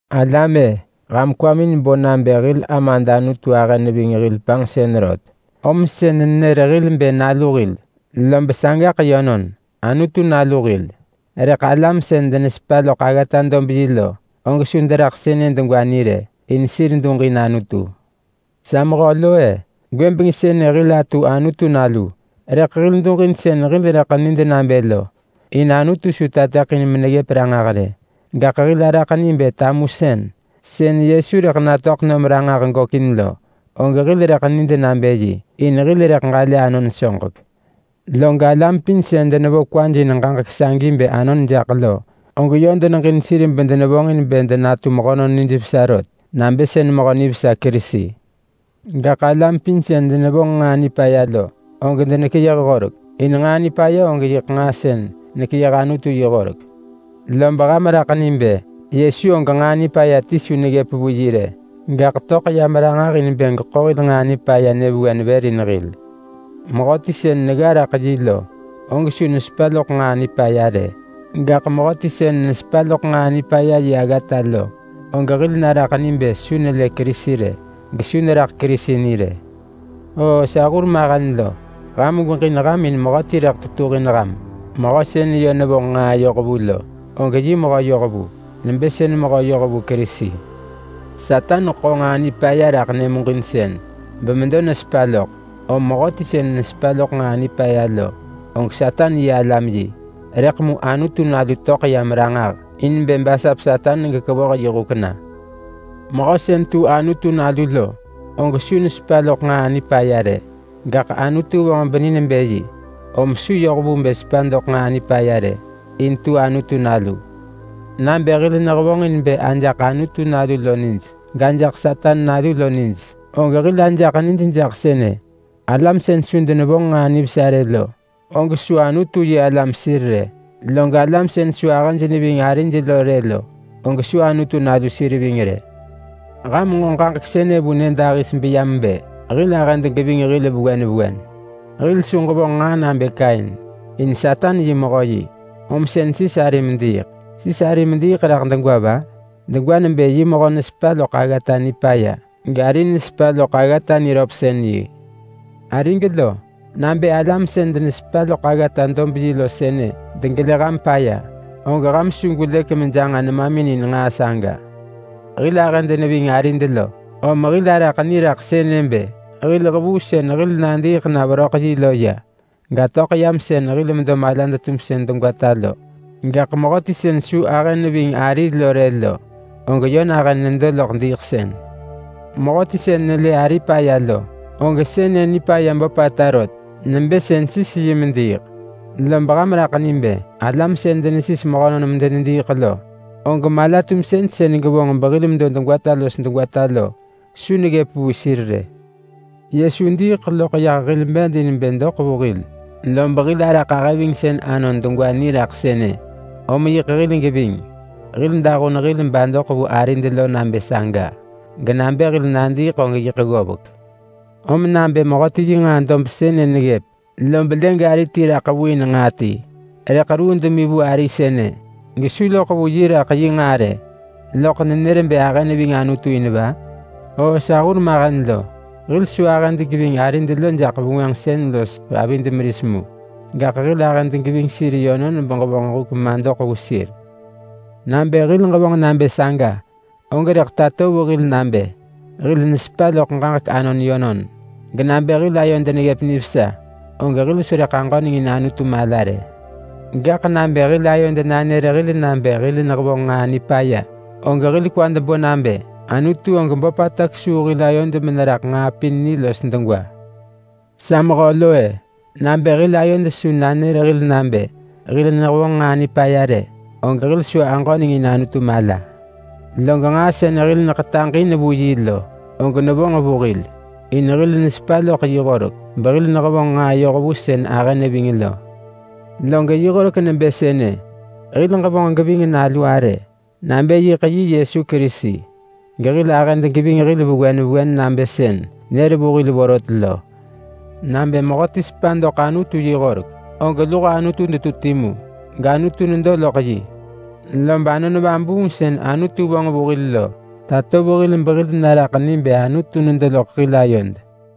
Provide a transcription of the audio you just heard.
Alam-e! Ham kwamin bo nabë hil Amad Anutu ahë neving hil panġsën rot, om sën nenër hil bë nalu hil lob sagaḳ yönon-Anutu nalu hil. Rëḳ alam sën denesepa loḳ aggata-dob-yi lo, og su deraḳ sënë degwa ni rë, in sir duġin Anutu. Sa mehö lo-e! Gwëbeng sënë hil atu Anutu nalu, rëḳ hil duġin sën hil rëḳ nid nabë lo, in Anutu su tateḳin meneggëp ranġah rë. Gaḳ hil araḳ ni bë tamusën, sën Yesu rëḳ natöḳ nom ranġah gökin lo, og hil rëḳ nid nabë yi, in hil rëḳ ġalë anon soġek. Log alam pin sën denevo kwaj in ġaġek sagi bë anon jaḳ lo, og yö deneġin sir bedenevonġin bë denatu mehönon nijvesa rot nabë sën mehö nivesa Kerisi. Gaḳ alam pin sën denevonġ nġaa nipaya lo, og denekeyëh horek, in nġaa nipaya og yiḳ nġaa sën nekeyëh Anutu yi horek. Lob ham raḳ ni bë Yesu og nġaa nipaya ti su neggëp vu yi rë, gaḳ töḳ yam ranġah in bë geḳo hil nġaa nipaya nyëvewen vër in hil. Mehöti sën negga raḳ yi lo, og su nesepa loḳ nġaa nipaya rë. Gaḳ mehöti sën nesepa loḳ nġaa nipaya yi aggata lo, og hil naraḳ ni bë su nelë Kerisi rë, gesu neraḳ Kerisi ni rë. Oo sa hur mahen lo! Ham gweġin ham in mehöti rëḳ tetuhin ham. Mehö sën yö nevonġ nġaa yohvu lo, og yi mehö yohvu nebë sën mehö yohvu Kerisi. Satan ḳo nġaa nipaya raḳ nyëmuġinsën bemedo nesepa loḳ, om mehöti sën nesepa loḳ nġaa nipaya lo, og Satan yi alam yi. Rëḳ mu Anutu Nalu töḳ yam ranġah in bë basap Satan gekevoh yi huk na. Mehö sën tu Anutu nalu lo, og su nesepa loḳ nġaa nipaya rë. Gaḳ Anutu vonġ beni nebë yi, om su yoh vu bë sepa doḳ nġaa nipaya rë, in tu Anutu nalu. Nabë hil nehevonġin bë ajaḳ Anutu nalu lo nij, gajaḳ Satan nalu lo nij, og hil ajaḳ nij nabë sënë: Alam sën su denevonġ nġaa nivesa rë lo, og su Anutu-yi-alam sir rë. Log alam sën su ahëj neving arij lo rë lo, og su Anutu nalu sir ving rë. Ham nġo ġaġek sënë vu nyëdahis beyam bë: Hil ahëd geving hil vewen vewen. Hil su ġevonġ nġaa nabë Kain. In Satan yi mehö yi, om sën sis ari mediiḳ. Sis ari mediiḳ degwa raḳ va? Degwa nebë yi mehö nesepa loḳ aggata nipaya, gari nesepa loḳ aggata niröpsën-yi. Arig lo! Nabë alam sën denesepa loḳ aggata-dob-yi lo sënë degelë ham paya, og ham su gwelëk mejanġa nemamin in nġaa saga. Hil ahëd neving arid lo, om hil araḳ ni raḳ sënë bë: Hil hevuu sën hil nadiiḳ na veröḳ yi lo ya, gatöḳ yam sën hil medo malad-tumsën degwata lo. Gaḳ mehöti sën su ahë neving ari lo rë lo, og yö nahën nedo loḳ diiḳsën. Mehöti sën nelë ari paya lo, og sënë nipaya böpata rot nebë sën sis yi mediiḳ. Lob ham raḳ ni bë alam sën denesis mehönon medenediiḳ lo, og mala-tumsën sën gevonġ behil medo degwata los degwata lo su neggëp vu sir rë. Yesu diiḳ loḳ yah hil bed in bë doḳ vu hil, lob hil araḳ ahëvingsën anon degwa ni raḳ sënë. Om yiḳ hil geving. Hil dahun hil badoḳ vu arid lo nabë saga, genabë hil nadiiḳ og yiḳ ggovek. Rëḳ mu nabë mehöti yi nġaa dob sënë neggëp, lob lë gari ti raḳ vu in nġaa ti, rëḳ ruu demi vu ari sënë, gesu loḳ vu yi raḳ yi nġaa rë, loḳ nenër bë ahë neving Anutu in va? Oo sa hurmahen lo, hil su ahëd geving arid lo jaḳ vengwënġsën los avid meris mu, gaḳ hil ahëd geving sir yönon beġevonġ huk madoḳ vu sir. Nabë hil ġevonġ nabë saga, og rëḳ tato vu hil nabë: Hil nesepa loḳ ġaġek anon yönon, genabë hil ayod neggëp nivesa, om hil su rëḳ aġöneng in Anutu mala rë. Gaḳ nabë hil ayod nanër hil nabë hil nehevonġ nġaa nipaya, og hil kwad bo nabë Anutu og böpata kesuu hil ayod meneraḳ nġaa pin ni los degwa. Sa mehö lo-e! Nabë hil ayod su nanër hil nabë hil nehevonġ nġaa nipaya rë, og hil su aġöneng in Anutu mala. Log nġaa sën hil neḳetaġ in vu yi lo, og nevonġ vu hil. In hil nesepa loḳ yi horek behil nehevonġ nġaa yoh vu sën ahë neving lo. Log yi horek nebë sënë: Hil ġevonġ geving Nalu arë nabë yiḳ yi Yesu Kerisi, gehil ahëd geving hil vewen vewen nabë sën nër vu hil vorot lo. Nabë mehöti sepa doḳ Anutu yi horek, og luho Anutu detu timu gAnutu nedo loḳ yi. Lob Anon Vabuung sën Anutu vonġ vu hil lo tato vu hil behil naraḳ ni bë Anutu nedo loḳ hil ayod.